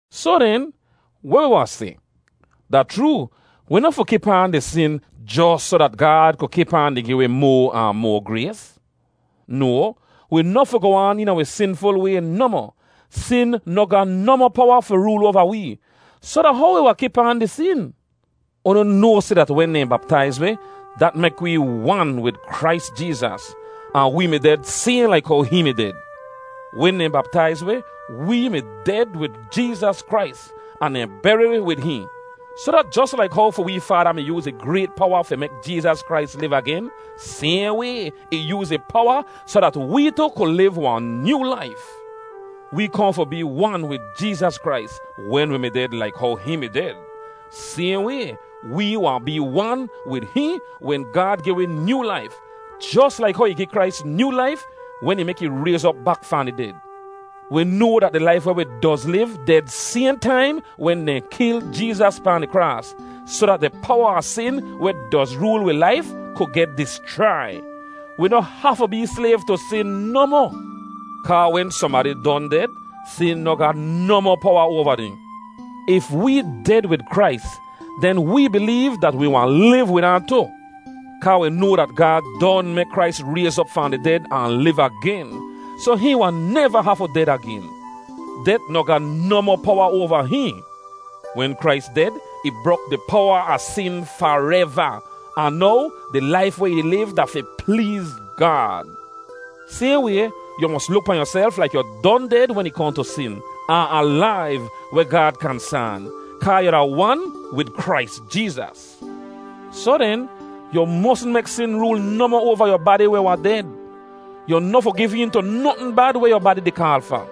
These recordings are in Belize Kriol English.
Soh den, weh wi wahn seh? Da chroo, wi noh fi kip aan di sin jos soh dat Gaad ku kip aan di gi wi moa ahn moa grays. No, wi noh fi goh aan eena wi sinful way nohmoh. Sin noh ga nohmoh powa fi rool oava wee, soh da how wi wahn kip aan di sin? Unu noa seh dat wen dehn baptaiz wi, dat mek wee wan wid Krais Jeezas, ahn wee mi ded sayhn laik how hihn mi ded. Wen dehn baptaiz wi, wee mi ded wid Jeezas Krais ahn dehn beri wi wid hihn, soh dat jos laik how fi wee Faada mi yooz ih grayt powa fi mek Jeezas Krais liv agen, sayhn way, ih yooz ih powa soh dat wee tu ku liv wahn nyoo laif. Wee kohn fi bee wan wid Jeezas Krais wen wi mi ded laik how hihn mi ded. Sayhn way, wee wahn bee wan wid hihn wen Gaad gi wi nyoo laif, jos laik how ih gi Krais nyoo laif wen ih mek ih rayz op bak fahn di ded. Wi noa dat di laif weh wi doz liv ded sayhn taim wen dehn kil Jeezas pahn di kraas, soh dat di powa a sin weh doz rool wi laif ku geh dischrai. Wi noh hafu bee slayv tu sin nohmoh. Kaa wen sohnbadi don ded, sin noh ga nohmoh powa oava dehn. If wee ded wid Krais, den wee bileev dat wi wahn liv wid ahn tu. Kaa wi noa dat Gaad don mek Krais rayz op fahn di ded ahn liv agen, soh hihn wahn neva hafu ded agen. Det noh ga nohmoh powa oava hihn. Wen Krais ded, ih brok di powa a sin fareva, ahn now di laif weh ih di liv da fi pleez Gaad. Sayhn way, yu mos luk pahn yuself laik yu don ded wen ih kohn tu sin, ahn alaiv weh Gaad kansaan, kaa yu da wan wid Krais Jeezas. Soh den, yu mosn mek sin rool nohmoh oava yu badi weh wahn ded. Yu noh fi giv een tu notn bad weh yu badi di kaal fa.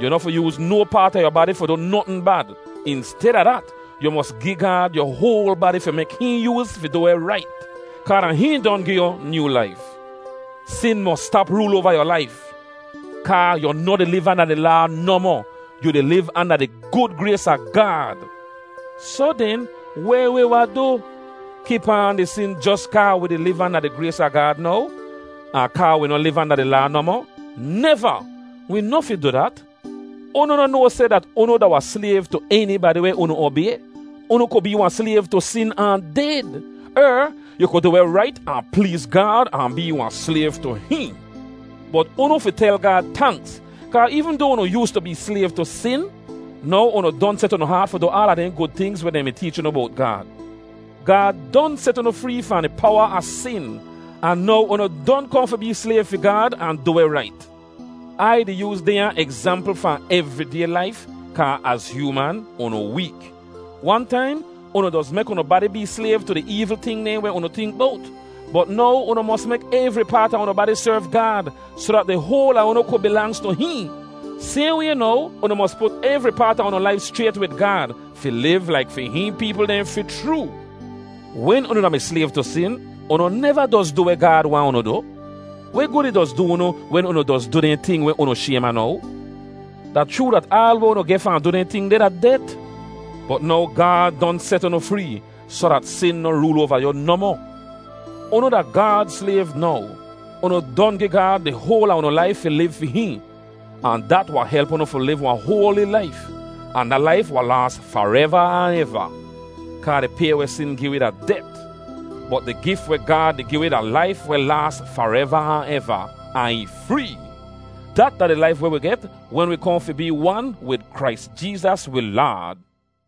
Yu noh fi yooz no paat a yu badi fi du notn bad. Insteda dat, yu mos gi Gaad yu hoal badi fi mek hihn yooz fi du weh rait, kaa da hihn don gi yu nyoo laif. Sin mos stap rool oava yu laif, kaa yu noh di liv anda di Laa nohmoh; yu di liv anda di gud grays a Gaad. Soh den, weh wi wahn du? Kip aan di sin jos kaa wi di liv anda di grays a Gaad now, ahn kaa wi noh liv anda di Laa nohmoh? Neva! Wi noh fi du dat. Unu noh noa seh dat unu da wahn slayv tu enibadi weh unu obay? Unu ku bee wahn slayv tu sin ahn ded, er yu ku du weh rait ahn pleez Gaad ahn bee wahn slayv tu hihn. Bot unu fi tel Gaad tanks, kaa eevn doa unu yoostu bee slayv tu sin, now unu don set unu haat fi du aala dehn gud tingz weh dehn mi teech unu bowt Gaad. Gaad don set unu free fahn di powa a sin, ahn now unu don kohn fi bee slayv fi Gaad ahn du weh rait. Ai di yooz dehnya egzampl fahn evriday laif, kaa az hyooman, unu week. Wan taim, unu doz mek unu badi bee slayv tu di eevl ting dehn weh unu tink bowt, bot now unu mos mek evri paat a unu badi serv Gaad soh dat di hoal a unu ku bilangz tu hihn. Sayhn way now, unu mos put evri paat a unu laif schrayt wid Gaad fi liv laik fi hihn peepl dehn fi chroo. Wen unu da-mi slayv tu sin, unu neva doz du weh Gaad waahn unu du. Weh gud ih doz du unu wen unu doz du dehn ting weh unu shaym a now? Da chroo dat aal weh unu geh fahn du dehn ting deh da det. Bot now Gaad don set unu free soh dat sin noh rool oava yu nohmoh. Unu da Gaad slayv now. Unu don gi Gaad di hoal a unu laif fi liv fi hihn, ahn dat wahn help unu fi liv wahn hoali laif, ahn da laif wahn laas fareva ahn eva. Kaa di pay weh sin gi wi da det, bot di gif weh Gaad di gi wi da laif weh laas fareva ahn eva, ahn ih free. Dat da di laif weh wi get wen wi kohn fi bee wan wid Krais Jeezas wi Laad.